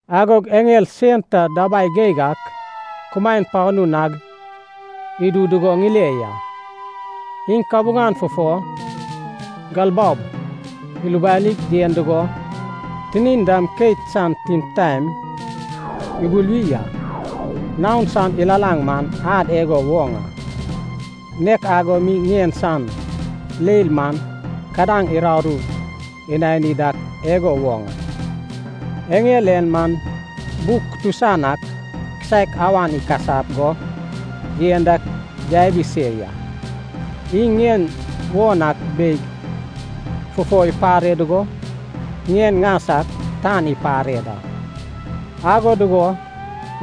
Agog eŋel sen ta dabai geig ak kumaen panu nag idu dugo ŋile ya. Iŋ kabuŋan fufo galbaob ilubanig yen dugo tinin dam keit san timtaen ibuluwi a. Naon san ilalaŋ man ad igo woŋ a, nek ago mi ŋien san leil man kadaŋ uraru inani dak igo woŋ a. Eŋel en man buk kutusan ak kisaek awan ikasap go yen dak yabi se ya. Iŋ ŋien won ak beig fufo ipare dugo, ŋien ŋas ak tan ipare da. Ago dugo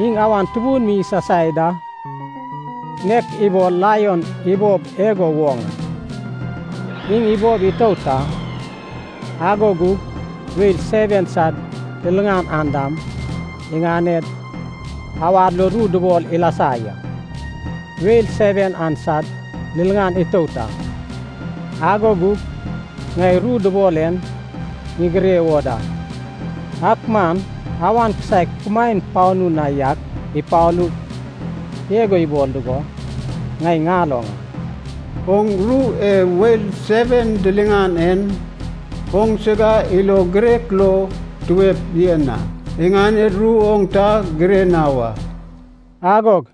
iŋ awan tubun mi isasai da, nek ibol laion ibob igo woŋ a. Iŋ ibob itout a, ago gug weil seven sad liliŋan an dam iŋaned awad lo ru dubol ilasa ya. Weil seven an sad liliŋan itout a, ago gug ŋai ru dubol en ŋigire wo da. Ak man awan kisaek kumaen panu na yak ipalug igo ibol dugo ŋai ŋaloŋ a, “Oŋ ru e weil seven diliŋan en oŋsiga ilo girek lo tuep yen a. Iŋaned ru oŋ ta gire na wa.” Agog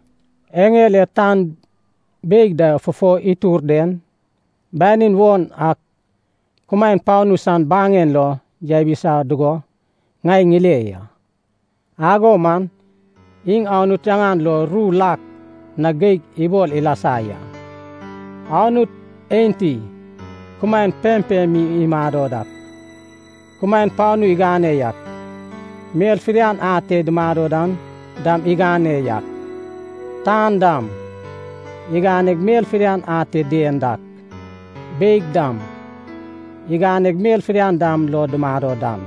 eŋel e tan beig da fufo itur den banin won ak kumaen panu san baŋen lo yabisa dugo ŋai ŋile ya. Ago man iŋ Anut yaŋan lo ru lak na geig ibol ilasa ya. Anut enti kumaen pempem mi imado dak, kumaen panu igane yak, mel fidian ate dumado dan dam igane yak, tan dam iganeg mel fidian ate dien dak, beig dam iganeg mel fidian dam lo dumado dan,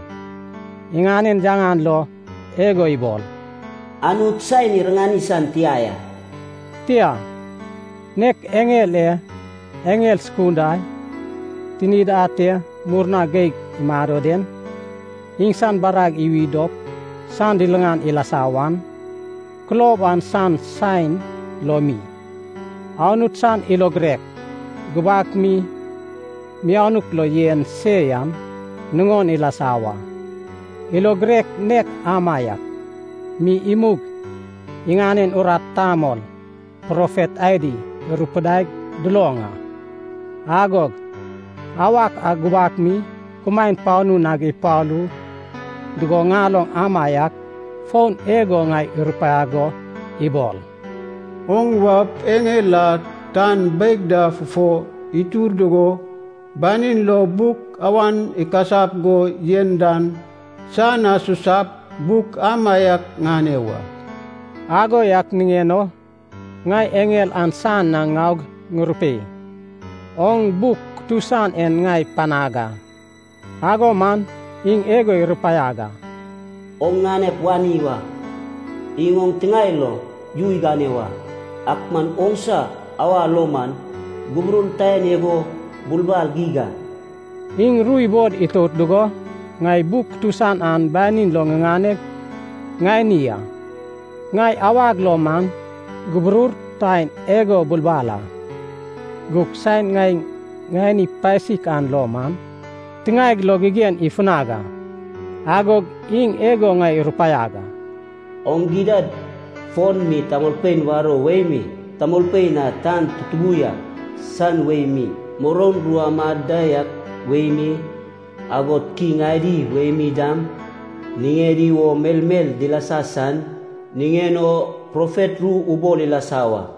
iŋanen yaŋan lo igo ibol, “Anut saen iriŋani san tia ya.” Tia, nek eŋel e eŋel sukunda tinid ate murna geig imado den, iŋsan barag iwi dop san liliŋan ilasa wan, kulob an san saen lo mi, Anut san ilo girek gubak mi mianuk lo yen se yan nuŋon ilasa wa. Ilo girek nek amaiak mi imug iŋanen urat tamol profet adi irupidaig duloŋ a. Agog awak a gubak mi kumaen panu nag ipalu dugo ŋaloŋ amaiak fon igo ŋai irupaiag go ibol, “Oŋ waup eŋel a tan beig da fufo itur dugo, banin lo buk awan ikasap go yen dan, san na susap buk amaiak ŋane wa.” Ago yak niŋen o ŋai eŋel an san na ŋaug ŋurupei, “Oŋ buk kutusan en ŋai panag a.” Ago man iŋ igo irupaiag a, “Oŋ ŋanep wani wa. Iŋ oŋ tiŋae lo yu igane wa. Ak man oŋsa awa lo man guburur taen igo bulbal geig a.” Iŋ ru ibol itout dugo, ŋai buk kutusan an banin lo ŋiŋaneg ŋani a. Ŋai awag lo man guburur taen igo bulbal a. Gug saen ŋai ŋani pasik an lo man tiŋaeg lo gigen ifunag a. Agog iŋ igo ŋai irupaiag a. “Oŋ gidad fon mi tamolpein warou wei mi, tamolpein a tan tutubu yak san wei mi, muroun ru amad da yak wei mi, agod kiŋ adi wei mi dam, niŋedi wo melmel dilasa san niŋen o profet ru ubol ilasa wa.”